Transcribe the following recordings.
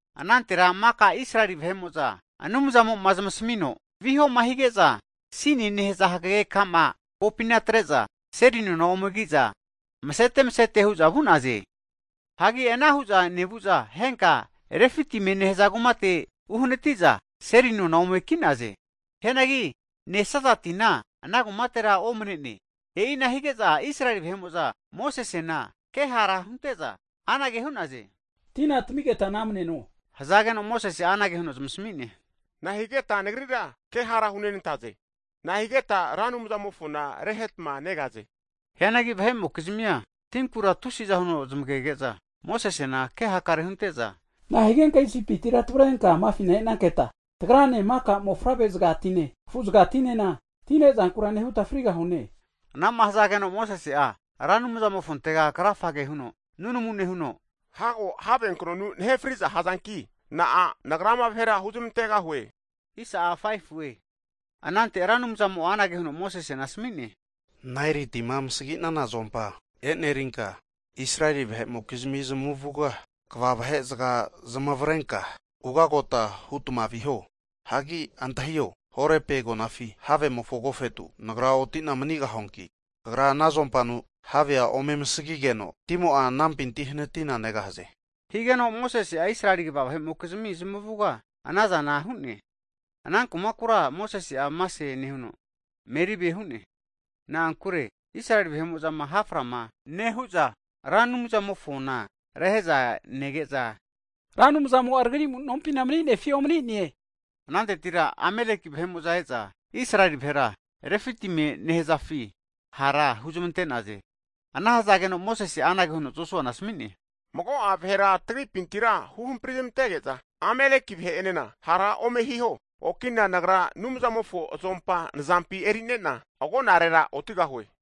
Anantera maka Israeli vahe'mo'za Anumzamo'ma zmasamino, vihoma hige'za Sinie nehaza hagege ka'ma kokana atre'za, seli nona ome ki'za masete masete hu'za vu'naze. Hagi ana hu'za nevu'za henka Refitimie nehaza kumate uhanati'za seli nona ome ki'naze. Hianagi nesaza tina ana kumatera omane'ne. E'ina hige'za Israeli vahe'mo'za Mosesena ke hara hunte'za, anage hu'naze. Tina tamigeta namneno, hazageno Mosese'a anage huno zamasami'ne, nahigeta nagrira ke hara hunentaze? Nahigeta Ra Anumzamofona rehetma negaze? Hianagi vahe'mokizmia tinkura tusiza huno zmagege'za, Mosesena ke hakare hunte'za, nahigenka Isipitira tavrenka amafina e'nanketa, tagrane maka mofavrezagatine, afu'zagatinena ti ne'zankura nehuta frigahune? Anama hazageno Mosese'a Ra Anumzamofontega krafa huno nunamu nehuno, Hago haveknonu nahe frigahazanki, na'a nagra ama vahera huzmantegahue huno antahige'ne? Anante Ra Anumzamo'a amanage huno asami'ne, Naeli tima amasagi'nana azompa eri'nenka, Israeli vahe'mokizmi zmavuga kva vahezaga zamavarenka ugagota hutma viho. Hagi antahio, Horepi agonafi havemofo agofetu Nagra otina manigahuanki, kagra ana azompanu havea ome amasagigeno, timo'a anampinti hanatina negahaze. Higeno Mosese'a Israeli kva vahe'mokizmi zmavuga ana zana hu'ne. Ana kumakura Mosese'a Masae nehuno, Meribae hu'ne, na'ankure Israeli vahe'mo'zama haframa nehu'za, Ra Anumzamofona rehe'za nege'za, Ra Anumzamo'a tagri amu'nompina mani'nefi omani'ne? Anantera Ameleki vahe'mo'za e'za, Israeli vahera Refitimie nehzafi hara huzmante'naze. Ana hazageno Mosese'a anage huno Josuana asmi'ne, Mago'a vahera tagripintira huhamprizmantege'za Ameleki vahe'enena hara ome hiho. Okina nagra Anumzamofo azompa nzampi eri'ne'na agonarera otigahue.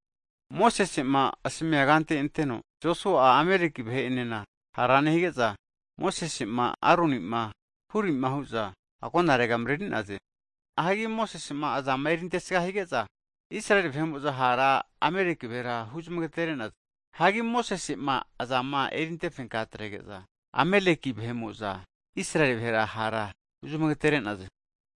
Mosese'ma asamia kante anteno, Josua'a Amaleki vahe'enena hara nehige'za, Mosese'ma, Aroni'ma, Huri'ma hu'za agonarega mreri'naze. Hagi Mosese'ma azama erintesga hige'za, Israeli vahe'mo'za hara Amaleki vahera huzmangatere'naze. Hagi Mosese'ma aza'ma erinte fenka atrege'za, Ameleki vahe'mo'za Israeli vahera hara huzmagetere'naze.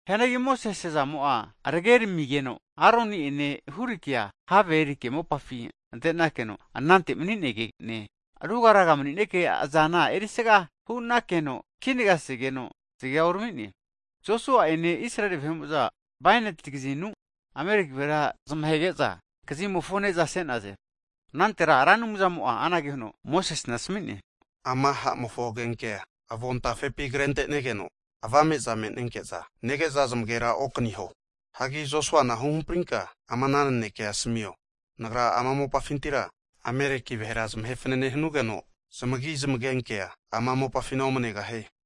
Hianagi Mosese azamo'a arageramigeno, Aroni'ene Hurikea have erike, mopafi ante'nakeno anante mani'nege'ne, rugaraga mani'neke azana erisga hu'nakeno kinagaseno zagea urami'ne, Josua'ene Israeli vahe'mo'za bainati kazinu Ameleki vahera zmahege'za kazimofo ne'za se'naze. Anantera Ra Anumzamo'a anage huno Mosesena asami'ne, Ama ha'mofo agenke'a avontafepi kretenegeno avame'za me'nenke'za nege'za zmagera okaniho. Hagi Josuana hamprinka ama ana nanekea asamio, Nagra ama mopafintira Ameleki vahera zamahe fanane hanugeno zmagi zmagenkea ama mopafina omanegahie.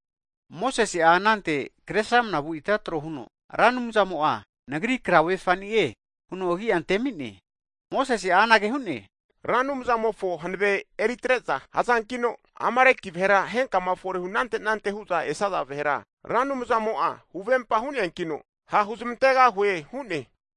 Mosese'a anante Kresramanavu ita tro huno, Ra Anumzamo'a nagri krauvefani'e (frekie) huno agia antemi'ne. Mosese'a anage hu'ne, Ra Anumzamofo hanave eritre'za hazankino, Amaleki vahera henkama fore hunante anante hu'za esaza vahera, Ra Anumzamo'a huvempa hu'neankino ha' huzmantegahue hu'ne.